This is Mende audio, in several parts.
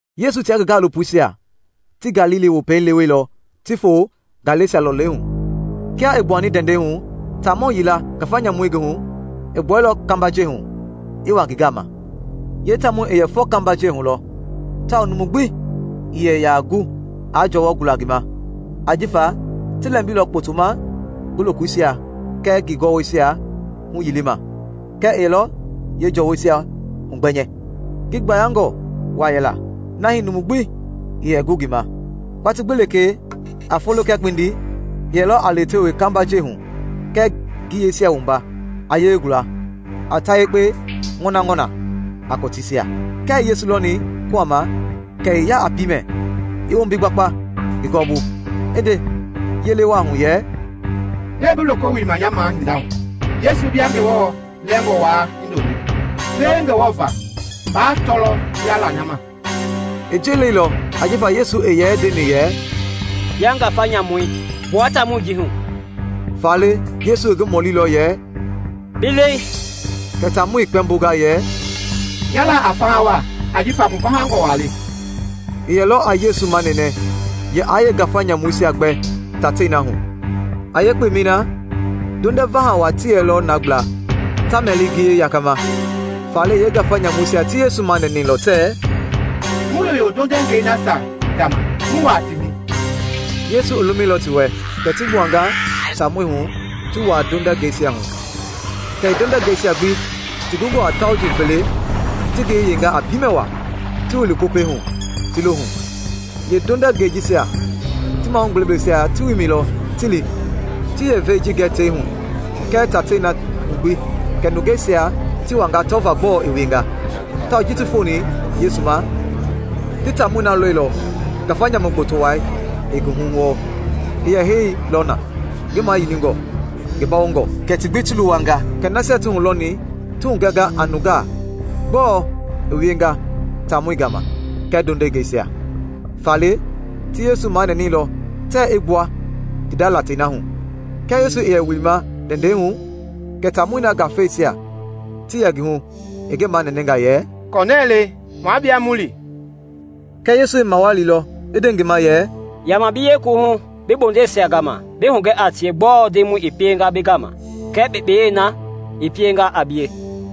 Yesu tia ngi gaalopoisia ti Galili Wopei leweilɔ ti foo Gɛlasa lɔlei hu. Kia i gbuani ndɛndɛi hu, taamɔ yila, ngafa nyamu i ngi hu, i gbuailɔ kambajɛi hu i wa ngi gama. Yeetaamɔi i yɛ fɔ kambajɛi hu lɔ tawao numu gbi ii yɛ ya gu aa jɔwɔ gula ngi ma; ajifa ti lɛmbilɔ kpotoma ngi lokoisia kɛɛ ngi gɔwɔisia huyilima kɛɛ i yɛlɔ yeejɔwɔisia hugbɛnyɛ. Ngi gbayangɔ wa yɛla na hii numu gbi ii yɛ gu ngi ma. Watii gbi lekee, a folo kɛɛ kpindi, i yɛlɔ a lewetewe kambajɛi hu kɛɛ ngiyeisia wumba, a yelei gula, a ta yekpe ŋɔnaŋɔna a kɔtiisia. Kia i Yesu lɔni kuhama kɛ i ya a piimɛ i wombi gbakpa ngi gɔwɔbu, i nde yele wa hu yɛ, “Gbɛe bi loko wilima nya mahinda hu, Yesu, bia Ngewɔ Lɛngɔ Wai Hindoloi? Pie Ngewɔ va baa tɔɔya la nya ma!” I ji leilɔ ajifa Yesu i yɛ ndeni yɛ, “Bia ngafa nyamui, gbua taamɔi ji hu!” Faale, Yesu i ngi mɔlilɔ yɛ, “Bi lɛi?” Kɛ taamɔi i kpɛmbonga yɛ, “Nya la a Fahawa ajifa mu vahangɔ wa le!” I yɛlɔ a Yesu manɛnɛ yɛ aa yeengafa nyamuisia gbɛ tatei na hu. A yeekpemɛi na ndondɛ vaha wa ti yɛlɔ na gbla, ta mɛli ngiyei yakama. Faale yeengafa nyamuisia ti Yesu manɛnɛilɔ tɛɛ, “Mu yoyo ndondɛngɛi nasia gama mu wua ti hu.” Yesu i lumɛilɔ ti wɛ, kɛ ti gbuanga taamɔi hu ti wua ndondɛngɛisia hu. Kɛ yeendondɛngɛisia gbi, ti gungɔ a tauji fele, ti ngiyei yeinga a piimɛ waa, ti wili popɛi hu, ti lo hu. Yeendondɛngɛisia ti mahugbeblɛisia ti wimɛilɔ ti li, ti yeevei ji gɛ tei hu kɛɛ tatei na hu gbi, kɛ nungeisia ti wanga tɔva gbɔɔ i wienga. Tawao ji ti foni Yesu ma, ti taamɔi na lɔilɔ ngafa nyamu gboto wai i ngi hu wɔɔ. I yɛ heilɔ na, ngi mayilingɔ, ngi bawongɔ; kɛ ti gbi ti luwanga. Kɛ nasia ti hulɔni ti hugɛnga a nungaa gbɔɔ i wienga taamɔi gama kɛɛ ndondɛngɛisia. Faale, ti Yesu manɛnɛilɔ tɛɛ i gbua ti nda latei na hu. Kia Yesu i yɛ wilima ndɛndɛi hu kɛ taamɔi na ngafeisia ti yɛ ngi hu i ngi manɛnɛnga yɛ, “Kɔnɛɛ le, mua bie mu li.” Kɛɛ Yesu i mawalilɔ, i nde ngi ma yɛ, “Yama bi yekuwuhu bi bondeisia gama bi hugɛ a tie gbɔɔ Ndemɔi i pienga bi gama kɛɛ kpekpeyei na i pienga a bie.”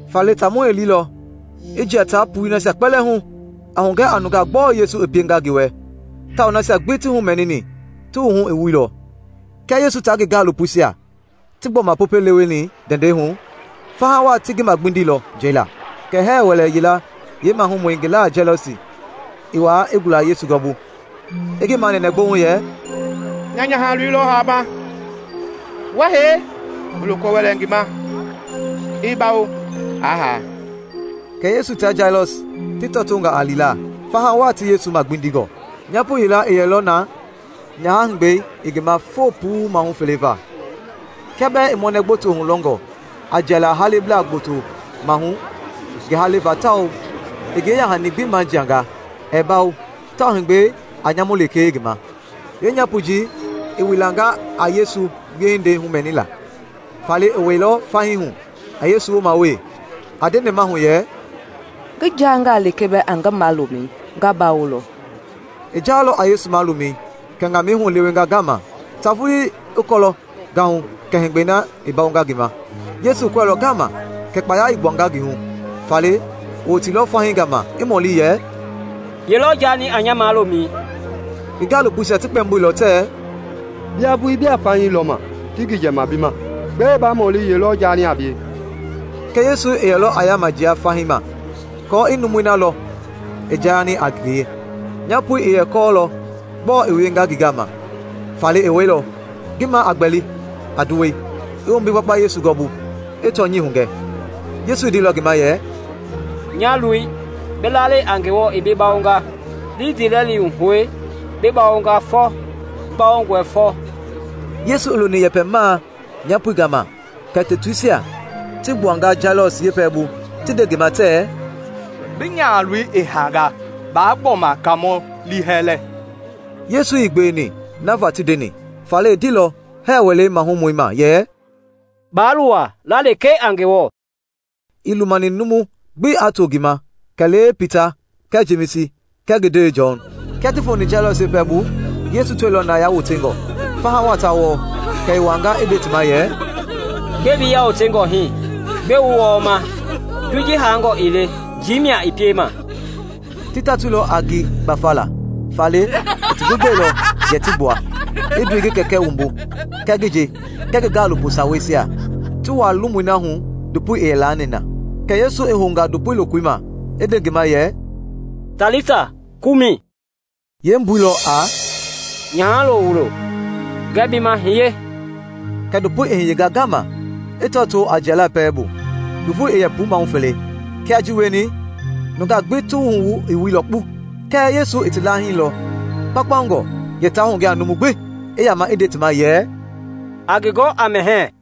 Faale, taamɔi i lilɔ, i jia taa puii nasia kpɛlɛɛ hu, a hugɛ a nungaa gbɔɔ Yesu i pienga ngi wɛ tawao nasia gbi ti humɛnini ti wuhu i wuilɔ. Kia Yesu taa ngi gaalopoisia ti gbɔma Popɛi leweni ndɛndɛi hu, faha wa ti ngi magbindilɔ njɛi laa. Kɛ hɛɛ wɛlɛ yila yeemahumɔi, ngi la a Jailɔs, i wa i gula Yesu gɔɔbu, i ngi manɛnɛ gbouŋ yɛ, “Nya nyahalo wuloi lɔ haama. Wa hee, bi loko wɛlɛ ngi ma i bawo, aa ha.” Kɛ Yesu tia Jailɔs ti tɔtonga a lila, faha wa ti Yesu magbindingɔ. Nyapo yila i yɛlɔ na nyaha-heegbɛi i ngi ma foo puu mahu fele va; kia bɛɛ i mɔnɛ gboto hulɔngɔ a jiala haleblaa gboto mahu ngi haleva tawao i ngi yeya-hani gbi majianga, ɛɛ bawo tawao heegbɛi a nyamu lekee ngi ma. Yeenyapoi ji i wilanga a Yesu wiehindeisia humɛnila, faale, i wɛilɔ fahii hu a Yesu wooma wee, a nde nɛmahu yɛ, “Ngi jangaa lekee bɛɛ a ngi malomɛi, nga bawolɔ.” I jaalɔ a Yesu malomɛi kɛ ŋamɛi hu i lewenga ngama, ta vulii i kɔɔ gahu kɛ heegbɛi na i bawonga ngi ma. Yesu i kɔɛilɔ ngama kɛ kpaya i gbuanga ngi hu, faale, i woteilɔ fahii gama i mɔli yɛ, “Ye lɔ jaani a nya malomɛi?” Ngi gaalopoisia ti kpɛmboilɔ tɛɛ, “Bia vulii bia fahii lɔma ti gijɛma bi ma; gbɛe ba mɔli ye lɔ jaani a bie?” Kɛɛ Yesu i yɛlɔ a yama jia fahii ma aako i numui na lɔ i jaani a ngie. Nyapoi i yɛ kɔɔlɔ gbɔɔ i wienga ngi gama, faale i wɛilɔ, ngi ma a gbɛli a nduwɛi, i wombi gbakpa Yesu gɔwɔbu, i tɔnyɛi hugɛ. Yesu i ndeilɔ ngi ma yɛ, “Nya loi, bi lalɛi a Ngewɔ i bi bawonga; li ndiilɛli hu hoe, bi bawonga fɔ.” Yesu i loni yɛpɛmaa nyapoi gama kɛ tutuisia ti gbuanga Jailɔs yeepɛlɛbu ti nde ngi ma tɛɛ, “Bi nyahaloi i hanga; baa gbɔma Kaamɔi liihɛlɛ.” Yesu ii gbeweni na va ti ndeni, faale i ndeilɔ hɛɛ wɛlei mahumɔi ma yɛ, “Baa luwa, la lekee a Ngewɔ.” Ii lumani numu gbi aa to ngi ma kɛlee Pita Kɛɛ Jemisi kɛɛ ngi ndewei Jɔn. Kia ti foni Jailɔs yeepɛlɛbu, Yesu tɔilɔ na yawotengɔ, faha wa ta wɔɔ. Kɛ i wuanga i nde ti ma yɛ, “Gbɛe mbei yawotengɔ hii? Gbɛe wu wɔɔma? Ndoi ji hangɔ ii le njii mia i piema!” Ti tɔtoilɔ a ngi gbafala, faale i ti gbi gbɛlɔ yɛ ti gbua, i ndoi ngi kɛkɛ wumbu kɛɛ ngi nje kɛɛ ngi gaalopo saweisia ti wua lomui na hu ndopoi i yɛ laani na. Kɛ Yesu i hounga ndopoi lokoi ma i nde ngi ma yɛ, “Talita Kumi,” yeembui lɔ a “Nyahalo wuloi, ngɛɛ bi ma, hiye!” Kɛ ndopoi i hiyenga ngama i tɔtoo a jiala pɛlei bu. (Ngi voi i yɛ puu mahu fele.) Kia ji wieni, nungaa gbi ti wuhu i wuilɔ kpu. Kɛɛ Yesu i ti laahilɔ kpaukpaungɔ yɛ taa hugɛ a numu gbi, i yama i nde ti ma yɛ, “A ngi gɔ a mɛhɛɛ.”